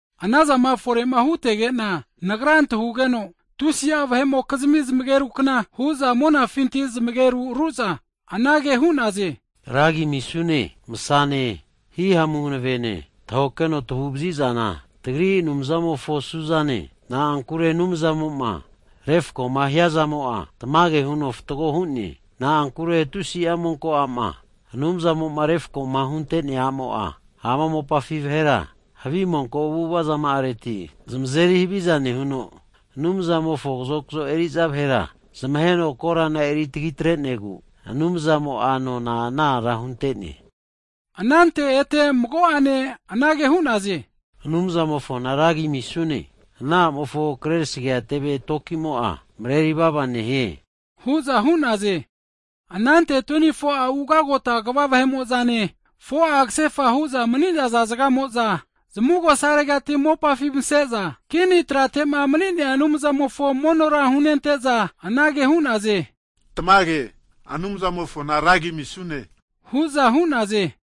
Anazama fore'ma hutege'na, nagra antahugeno, tusi'a vahe'mokizmi zmagerukna hu'za monafinti zmageru ru'za anage hu'naze, Ra agi amisune! Masazane hihamune hanavene tahokeno tagu'vazizana, tagri Anumzamofo su'zane. Na'ankure Anumzamo'ma refkoma hiazamo'a, tamage huno fatgo hu'ne, na'ankure tusi'a monko a'ma Anumzamo'ma refkoma huntenea a'mo'a, ama mopafi vahera havi monko avu'avazama'areti zmazeri haviza nehuno, Anumzamofo kazokzo eriza vahera zmaheno korana eritagi atrenegu, Anumzamo'a nona ana ara huntene. Anante ete mago'ane anage hu'naze, Anumzamofona Ra agi amisune! Ana a'mofo krerasagea teve tokimo'a mreri vava nehie hu'za hu'naze. Anante 24'a ugagota kva vahe'mo'zane, 4'a kasefa hu'za mni'naza zgamo'za zmavugosaregati mopafi mase'za, kini tratema mni'nea Anumzamofo monora hunente'za, anage hu'naze, Tamage Anumzamofona ra agi amisune! hu'za hu'naze.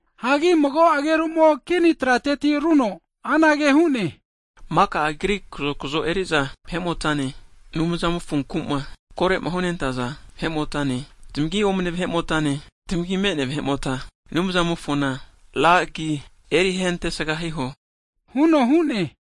Hagi mago agerumo kini trateti huno anage hu'ne, maka Agri kazokzo eri'za vahe'motane, Anumzamofonku'ma kore'ma hunentaza vahe'motane, tamagi omne vahe'motane, tamagi me'nea vahe'mota, Anumzamofona ra agi erihentesga hiho huno hu'ne.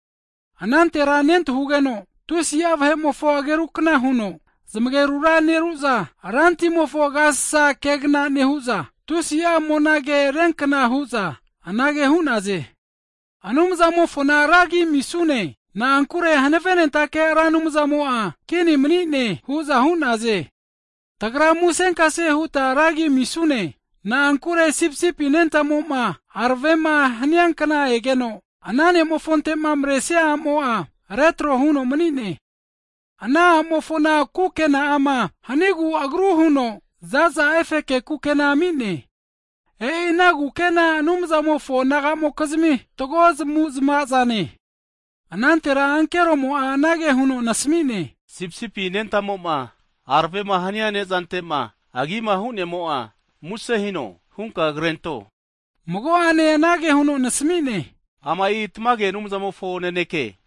Anantera nentahugeno tusi'a vahe'mofo agerukna huno zmagerura neru'za, ranra timofo agasasa kegna nehu'za, tusi'a monage hiankna hu'za, anage hu'naze, Anumzamofona ra agi amisune! Na'ankure hanavenentake Ra Anumzantimo'a kini manino kegva hu'ne hu'naze. Tagra musenkase huta ra agi amisune, na'ankure sipisipi anentamoma aravema hania kna egeno, ana ne'mofontema maresia a'mo'a retro huno mni'ne. Ana a'mofona kukenama hanigu agru huno zaza efeke kukena ami'ne. E'i ana zaza kukena Anumzamofo nagamokizmi fatgo zmavu'zmavazane. Anantera ankeromo'a anage huno nasamine, Sipisipi anentamo'ma aravema hania nezantema agima hu'nemo'a muse hino hunka krento, mago'ane anage huno nasamine, Ama'i tamage Anumzamofo naneke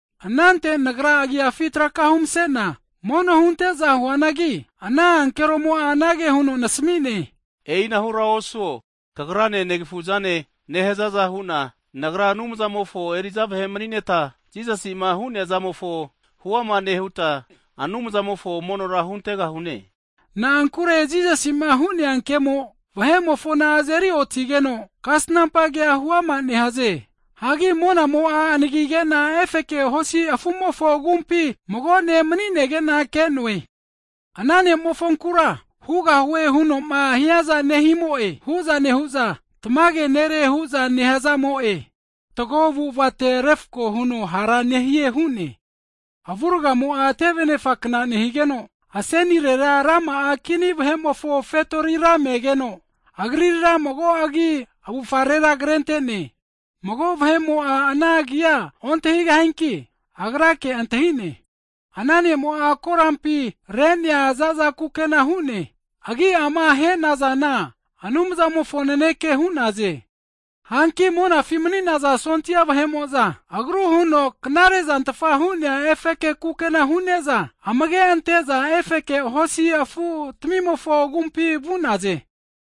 Anante nagranena agiafi narena rena mono hunte'za huanagi, ana ankeromo'a anage huno nasamine, e'inahura osuo, kagrane negafuzane nehazaza hu'na nagra Anumzamofo eri'za vahe mni'neta, Jisasi'ma hu'nea ke'mofo huama nehuta, Anumzamofo monora huntegahune. Na'ankure Jisasi'ma hu'nea kemo vahe'mofona azeri otigeno, kasnampa kea huama nehaze. Hagi monamo'a anagigena efeke hosi afu'mofo agumpi mago ne' mni'negena ke'noe. Ana ne' mofonkura, hugahue hunoma hiaza nehimo'e huza nehu'za tamage nere hu'za nehazamo'e. Fatgo avu'avate refko huno hara nehie hu'ne. Avurgamo'a teve anefakna nehigeno, asenirera rama'a kini vahe'mofo fetori me'geno, Agrira mago agi avufarera krentene, mago vahe'mo'a ana agia ontahigahianki, Agrake antahine. Ana ne'mo'a korampi re'nea zaza kukena hu'ne. Agi'ama henazana, Anumzamofo Naneke hu'naze. Hanki monafi mni'naza sondia (ami) vahe'mo'za agru huno knarezantfa hu'nea efeke kukena hu'ne'za, amage ante'za efeke hosi afutamimofo agumpi vu'naze.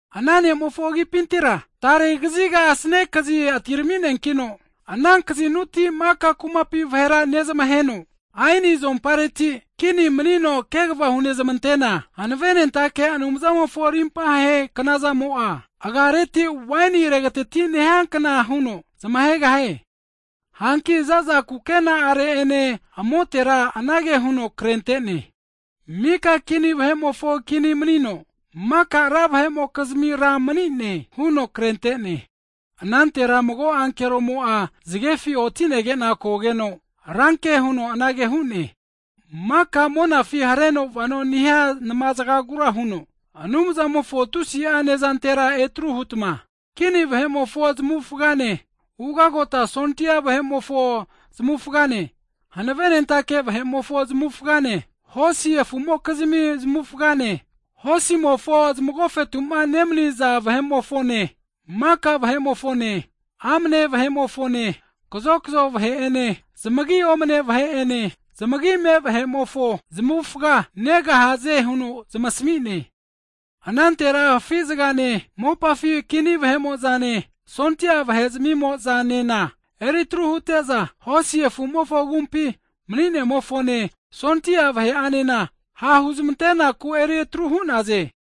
Ana ne'mofo agipintira tarekaziga asane kazi atiramineakino, ana kazinuti maka kumapi vahera nezmaheno, aeni azompareti kini manino kegva hunezmante'na, hanavenentake Anumzamofo rimpahe knazamo'a, agareti waini regatiti nehiakna huno zmahegahie. Hanki zaza kukena'are'ene amotera anage huno krentene, Mika kini vahe'mofo Kini manino, maka ra vahe'mokizmi Ra manine huno krentene. Anantera mago ankeromo'a zgefi otinegena kogeno, ranke huno anage hu'ne, maka monafima hareno vano nehia nma zgagura huno, Anumzamofo tusi'a nezantera etaru hutma, kini vahe'mofo zmavufgane, ugota sondia vahe'mofo zmavufgane, hanavenentake vahe'mofo zmavufgane, hosi afumokizmi zmavufgane, hosimofo zmagofetuma nemaniza vahe'mofone, maka vahemofone, amne vahe'mofone, kazokazo vahe'ene zmagi omne vahe'ene, zmagi me vahe'mofo zmavufga negahaze huno zamasmi'ne. Anantera afi zgane, mopafi kini vahe'mo'zane, sondia vahe'zmimozanena eri atru hute'za, hosi afumofo agumpi Mni'nemofone, sondia vahe'anena ha' huzmantenaku eri atru hu'naze.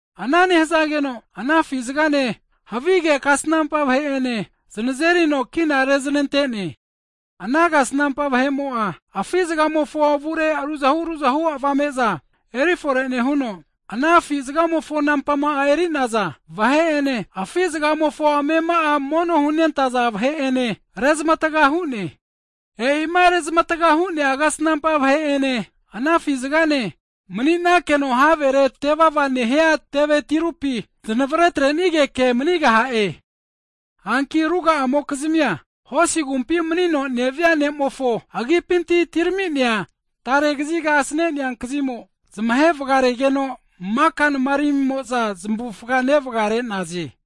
Ana nehazageno ana afi zgane, havige kasnampa vahe'ene zanazerino kina reznante'ne. Ana kasnampa vahe'mo'a, afi zgamofo avure ruzahu ruzahu avame'za eri fore nehuno, ana afi zgamofo nampama eri'naza vahe'ene, afi zgamofo amema'are mono hunentaza vahe'ene rezmataga hu'ne. E'ima rezmatga hu'nea kasnampa vahe'ene ana afi zgane mani'nakeno havere tevava nehia teve tirupi znavre atrenigeke manigaha'e. Hanki ruga'amokizmia, hosi agumpi manino nea ne'mofo agipinti atiraminea tare kaziga asanenea kazimo, zmahe vgaregeno maka nmaramimo'za zmavufga nevgare'naze.